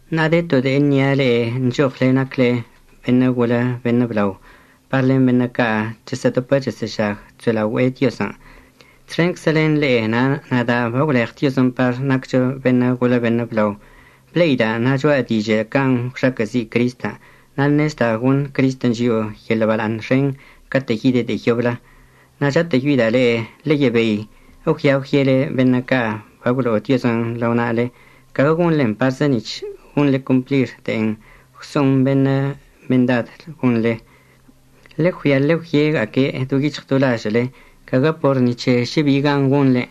Ṉa'a de to de'e əṉia' le'e nchoɉle nacle beṉə' golə beṉə' blao par len beṉə' ca' chesə'ədopə chesə'əžag chso'elaogüe'e Diozən'. Txenczə len le'e na' nada' bagwleɉ Diozən' par naccho beṉə' golə beṉə' blao. Ble'ida' na' cho'a dižə' can' gwxaquə'əzi' Cristən', na' ṉezda' goṉ Cristən' chio'o yeḻə' bala'aṉ xen catə' yide' de'e yoblə. Na' chatə'əyoida' le'e ḻeyebei əggüia əgwyele beṉə' ca' bagwlo'o Diozən' lao na'ale, caguə gonḻen parzə nic̱h gonḻe complir de'en gwso'on beṉə' mendad gonḻe. Ḻeggüia ḻegwyega'aque' do yic̱hɉ do lažə'əle, caguə por ni c̱he šə bi gan gonḻen'.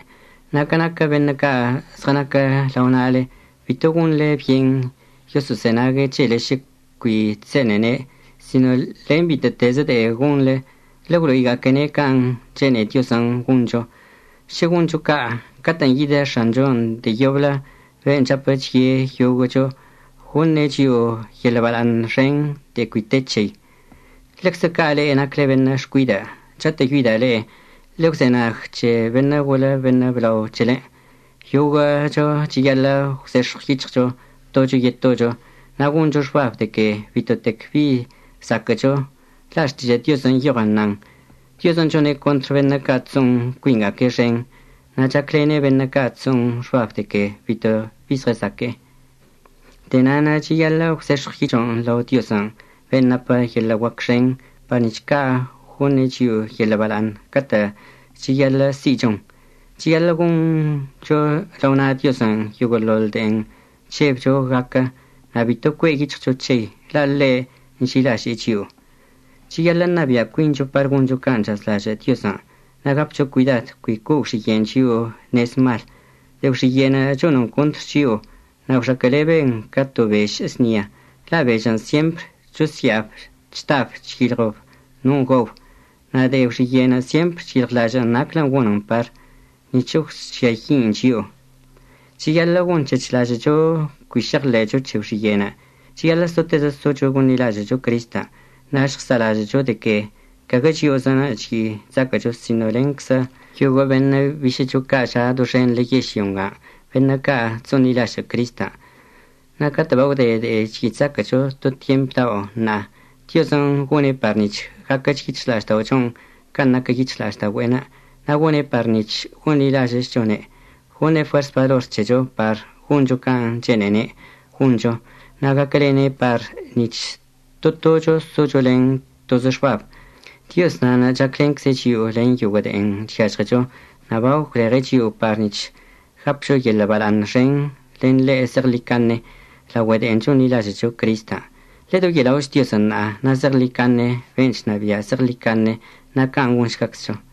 Na' ca naquə beṉə' ca' zɉənaquə lao na'ale, bito gonḻe byen yoso'ozenague' c̱hele šə cui chse'enene', sino len bitə'ətezə de'e gonḻe, ḻegwlo'iga'aquene' can' chene'e Diozən' goncho. Šə gonḻe ca' catə'ən yidə X̱anchon' de'e yoblə, ben' chapə chye' yoguə'əcho, goṉe' chio'o yeḻə' bala'aṉ xen de'e cui te c̱hei. Ḻeczə ca' le'e nacle beṉə' xcuidə', chatə'əyoida' le'e ḻegwzenag c̱he beṉə' golə beṉə' blao c̱helen'. Yoguə'əcho cheyaḻə' gwzex̱ɉw yic̱hɉcho tocho yetocho na' goncho xbab de que bitotec bi zaquə'əcho. La' Xtižə' Diozən' nyoɉən nan: Diozən' chone' contr beṉə' ca' chso'on cuinga'aque' xen, na' chaclene' beṉə' ca' chso'on xbab de que bitotec bi zɉəzaque'e. De'e na'anə' cheyaḻə' gwzex̱ɉw yic̱hɉchon' lao Diozən' ben' napə yeḻə' guac xen, par nic̱h ca' goṉe' chio'o yeḻə' bala'aṉ catə' cheyaḻə' si'ichon. Cheyaḻə' goncho lao na' Diozən' yoguə'əḻoḻ de'en chžebcho gaquə na' bitoch cue' yic̱hɉcho c̱hei, la' ḻe' nži'ilaže'e chio'o. Cheyaḻə' ṉabia' cuincho par goncho can' chazlažə' Diozən' na' gapcho cuidad cui co'o gwxiye'en chio'o nez mal. De'e gwxiye'en chonən contr chio'o na' gwxaquə'əleben ca to bež əznia la' bežən' syempr chosya'ab chdab chyilɉob non' gaob, na' de'e gwxiye'en syempr cheyilɉlažə'ən naclən' gonən par nic̱h əgwžiayi'in chio'o. Cheyaḻə' gonc̱hechlažə'əcho cui šeɉḻe'echo c̱he gwxiye'enə'. Cheyaḻə' sotezə socho gonḻilažə'əcho Cristən', na' əžɉsa'alažə'əcho de que caguə chio'ozənə' chyi' chzaquə'əcho sino lenczə yoguə' beṉə' bišə'əcho ca' ža' doxenḻə yežlyo ngan', beṉə' ca' chso'onḻilažə' Cristən'. Na' catə' bagwde de'en chyi' chzaquə'əcho to tyemp dao' ṉa'a, Diozən' gone' par nic̱h gaquəch yic̱hɉla'ažda'ochon' can' naquə yic̱hɉla'aždaogüe'enə', na' gone' par nic̱h gonḻilažə'əchchone'. Goṉe' fuers balor c̱hecho par goncho can' chene'ene' goncho, na' gaquəlene' par nic̱h to tocho socho len tozə xbab. Dioz na'anə' chaclencze' chio'o len yoguə' de'en chyažɉecho na' bagwleɉe' chio'o par nic̱h gapcho yeḻə' bala'aṉ xen len ḻe' zeɉḻicaṉe laogüe de'en chonḻilažə'əcho Cristən'. Ḻedoye'ela'och Diozən' ṉa'a na' zeɉḻicaṉe, ben' chnabia' zeɉḻicaṉe. Na' can' gonšgaczcho.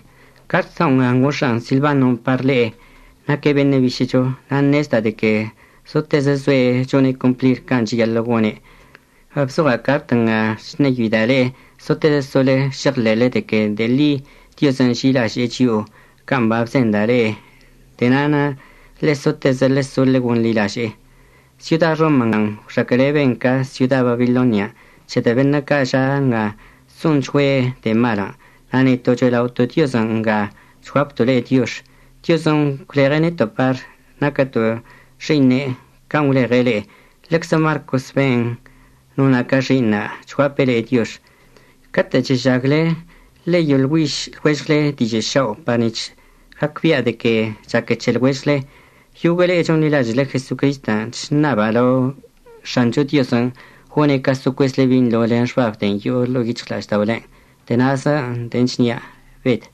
Cart dao' nga ngox̱a'an Silbanon' par le'e. Naque' bišə'əcho na' ṉezda' de que zotezə zoe' chone' complir can' cheyaḻə' gone'. Babzoɉa' cart nga chṉeyoida' le'e sotezə sole šeɉḻe'ele de que de'e ḻi Diozən' nži'ilaže'e chio'o can' babzenda' le'e. De'e na'anə' ḻe'e sotezə ḻeso ḻegonḻilaže'e. Syoda Roma ngan' gwxaquə'əleben ca syoda Babilonian' c̱hedə' beṉə' ca' ža' nga chso'onchgüe' de'e malən'. Na' neto' cho'ela'oto' Diozən' nga chguapto' le'e diox. Diozən' gwleɉe' neto' par naquəto' xi'iṉe' can' gwleɉe' le'e. Ḻeczə Marcos ben' nona' ca xi'iṉa' chguape' le'e diox. Catə' chežagle ḻeyoḻgüiž lɉuežɉle dižə' šao' par nic̱h gacbia' de que chaque c̱he lɉuežɉle. Yoguə' le'e chonḻilažə'əle Jesocristən' chṉaba' lao X̱ancho Diozən' gone' ca so cuezle binḻo len xbab de'en yo'o ḻo'o yic̱hɉla'ažda'olen'. De'e na'azə de'e chnia'. Bed